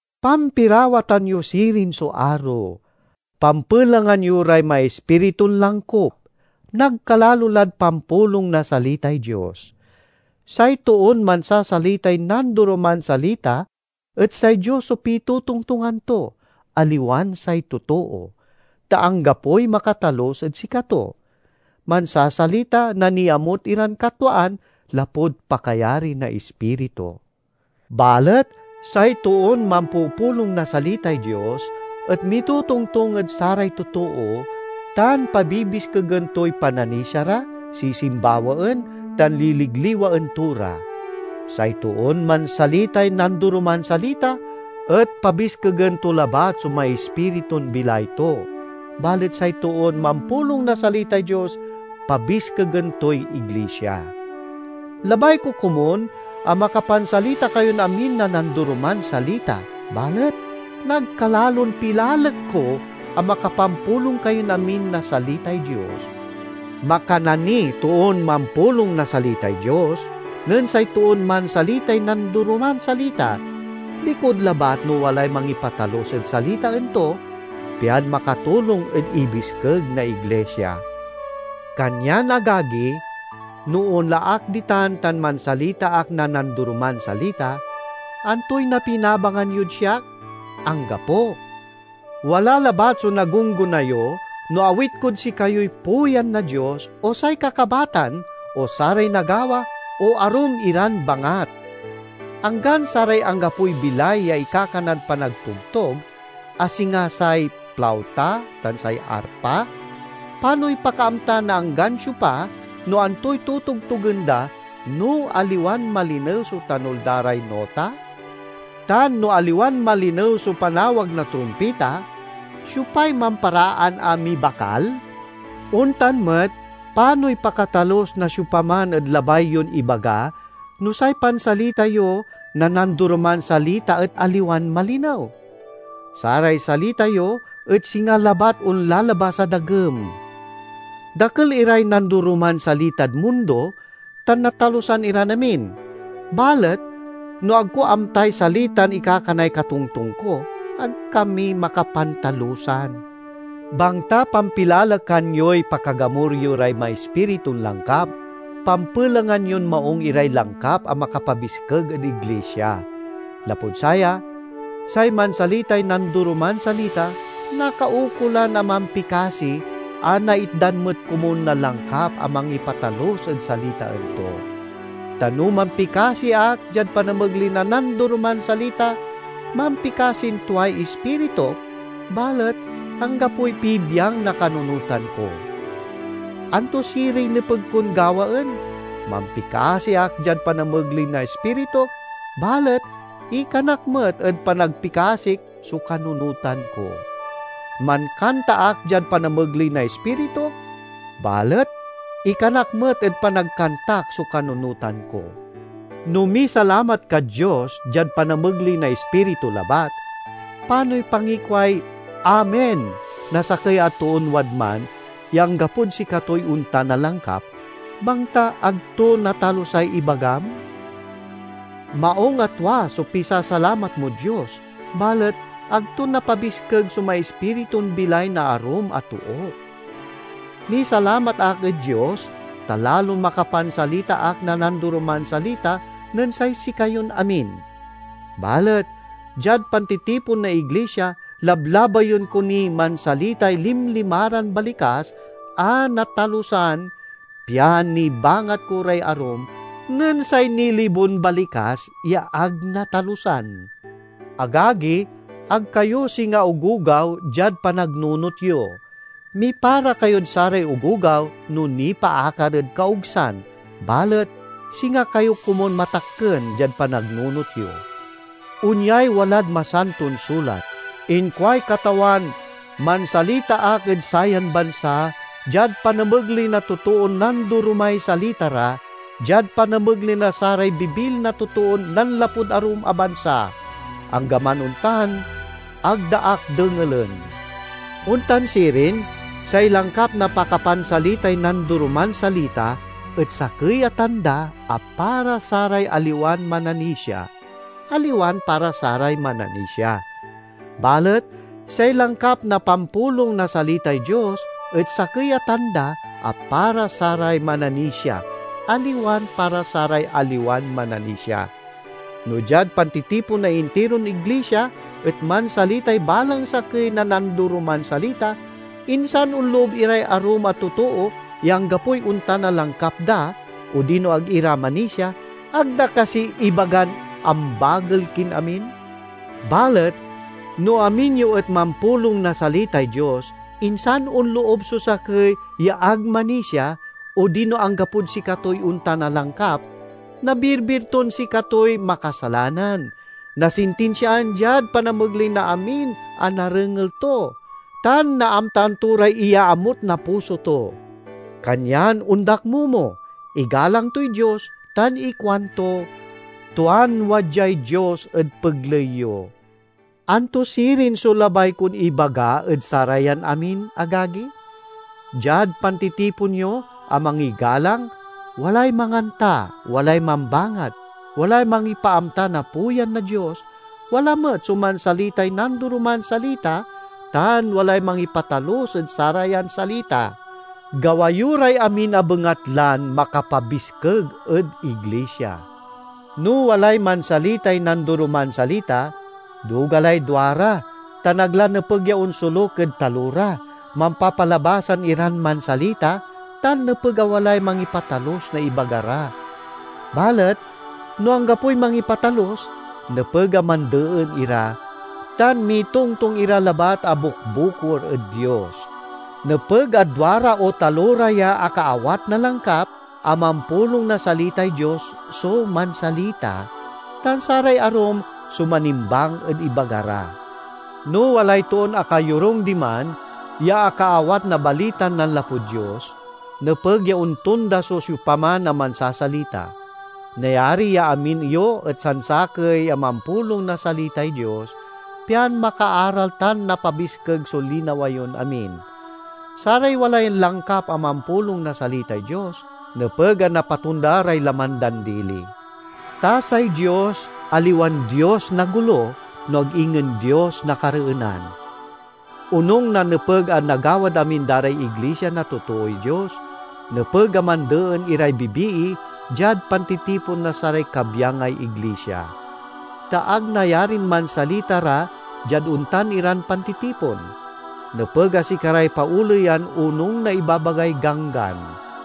Pampirawatan yo sirin so aro. Pampelengan yo ray maispiritun langkup, nagkalalo lad pampulong na salitay Dios. Say toon mansasalitay nandoroman salita et say Dios so pitotongtongan to, aliwan say totoo, ta anggapoy makatalus ed sikato. Mansasalita na niamut iran katwaan lapud pakayari na Ispiritu. Balet say toon mampupulong na salitay Dios et mitotongtong ed saray totoo tan pabibiskegen toy pananisia ra, sisimbawaen, tan liligliwaen to ra. Say toon mansalitay nandoroman salita et pabiskegen to labat so maispiritun bilay to, balet say toon mampulong na salitay Dios pabiskegen toy iglisia. Labay ko komun a makapansalita kayon amin na nandoroman salita, balet nagkalalon pilalek ko a makapampulong kayon amin na salitay Dios. Makana niy toon mampulong na salitay Dios nen say toon mansalitay nandoroman salita, likud labat no walay mangipatalus ed salitaen to, pian makatulong ed ibiskeg na iglisia. Kanyan, agagi, no onla ak ditan tan mansalita ak na nandoroman salita, antoy napinabangan yod siak? Anggapo! Wala labat so nagunggona yo, no awit kod sikayoy puyan na Dios, o say kakabatan, o saray nagawa, o arum iran bangat. Anggan saray anggapoy bilay ya ikakanad panagtogtog, a singa say plauta tan say arpa—panoy pakaamta na anggan siopa no antoy totogtogen da, no aliwan malinew so tanul da ray nota? Tan no aliwan malinew so panawag na trumpita, siopay mamparaan a mibakal? Ontan met, panoy pakatalus na siopaman ed labay yon ibaga no say pansalita yo na nandoroman salita et aliwan malinew? Saray salita yo et singa labat onlalabas a dagem! Dakel iray nandoroman salitad mundo, tan natalusan iran amin. Balet no ag ko amtay salitan ikakanay katongtong ko, ag kami makapantalusan. Bangta pampilalekan yoy pakagamur yo ray maispiritun langkap, pampelengan yon maung iray langkap a makapabiskeg ed iglisia. Lapud saya, say mansalitay nandoroman salita nakaukolan a mampikasi a naitdan met komun na langkap a mangipatalus ed salitaen to. Ta no mampikasi ak diad panamegley na nandoroman salita, mampikasin tuay ispirituk, balet anggapoy pibiang na kanunotan ko. Anto siriy nepeg kon gawaen? Mampikasi ak diad panamegley na ispirituk, balet ikanak met ed panagpikasik so kanunotan ko. Mankanta ak diad panamegley na ispirituk, balet ikanak met ed panagkantak so kanunotan ko. No misalamat kad Dios diad panamegley na ispiritu labat, panoy pangikuay "Amen" na sakey a toon wadman ya anggapod sikatoy ontan a langkap, bangta ag to natalusay ibagam? Maung a tua so pisasalamat mod Dios, balet ag to napabiskeg so maispiritun bilay na arum a too. Misalamat ak ed Dios, ta lalon makapansalita ak na nandoroman salita nen say sikayon amin. Balet diad pantitipon na iglisia, lablabayen ko niy mansalitay limlimaran balikas a natalusan pian nibangat ko ray arum, nen say nilibon balikas ya ag natalusan. Agagi, ag kayo singa ogogaw diad panagnunot yo. Mipara kayod saray ogogaw no nipaakar ed kaogsan, balet singa kayo komun matakken diad panagnunot yo. Onyay walad Masanton Sulat, "Inkuay Katawan: mansalita ak ed sayan bansa, diad panamegley na totoon nandoromay salita ra, diad panamegley na saray bibil na totoon nanlapud arum a bansa. Anggaman ontan, ag da ak dengelen." Ontan sirin, say langkap na pakapansalitay nandoroman salita et sakey a tanda a para saray aliwan mananisia, aliwan para saray mananisia. Balet say langkap na pampulong na salitay Dios et sakey a tanda a para saray mananisia, aliwan para saray aliwan mananisia. No diad pantitipon na intiron iglisia et mansalitay balang sakey na nandoroman salita, insan onloob iray arum a totoo ya anggapoy ontan a langkap da odino ag ira manisia, ag da kasi ibagan ambagel kin amin? Balet no amin yo et mampulong na salitay Dios, insan onloob so sakey ya ag manisia odino anggapod sikatoy ontan a langkap, nabirbir ton sikatoy makasalanan, nasintinsiaan diad panamegley na amin a narengel to, tan naamtaan to ray iyaamut na puso to. Kanyan ondakmomo, igalang toy Dios, tan ikuanto, "Tuan wadyay Dios ed pegley yo!" Anto sirin so labay kon ibaga ed sarayan amin, agagi? Diad pantitipon yo a mangigalang, walay manganta, walay mambangat, walay mangipaamta na puyan na Dios, wala met so mansalitay nandoroman salita, tan walay mangipatalus ed sarayan salita. Gawa yo ray amin a bengatlan makapabiskeg ed iglisia. No walay mansalitay nandoroman salita, duga lay duara tan ag la nepeg ya onsoluk ed talora, mampapalabasan iran mansalita, tan nepeg a walay mangipatalus na ibaga ra. Balet no anggapoy mangipatalus, nepeg a mandeen ira, tan mitongtong ira labat a bukbukor ed Dios. Nepeg a duara o talora ya akaawat na langkap a mampulong na salitay Dios so mansalita, tan saray arum so manimbang ed ibaga ra. No walay toon akayorung diman ya akaawat na balitan nanlapud Dios, nepeg ya ontonda so siopaman a mansasalita. Nayari ya amin yo et sansakey a mampulong na salitay Dios, pian makaaral tan napabiskeg so linawa yon amin. Saray walay langkap a mampulong na salitay Dios nepeg a napatonda ray laman dan dili. Ta say Dios aliwan Dios na golo, no ag ingen Dios na kareenan. Onung na nepeg a nagawad amin da ray iglisia na totooy Dios, nepeg a mandeen iray bibii diad pantitipon na saray kabyangay iglisia. Ta ag nayarin mansalita ra diad ontan iran pantitipon; nepeg a sikaray paoleyan onung na ibabagay Ganggan.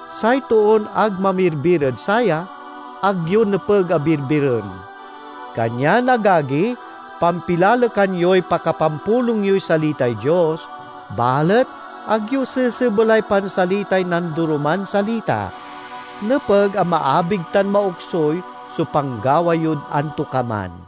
Say toon ag mamirbir ed saya, ag yo nepeg a birbiren. Kanyan, agagi, pampilalekan yoy pakapampulong yoy salitay Dios, balet ag yo sesebelay pansalitay nandoroman salita. Nepeg a maabig tan maoksuy so panggawa yod antokaman.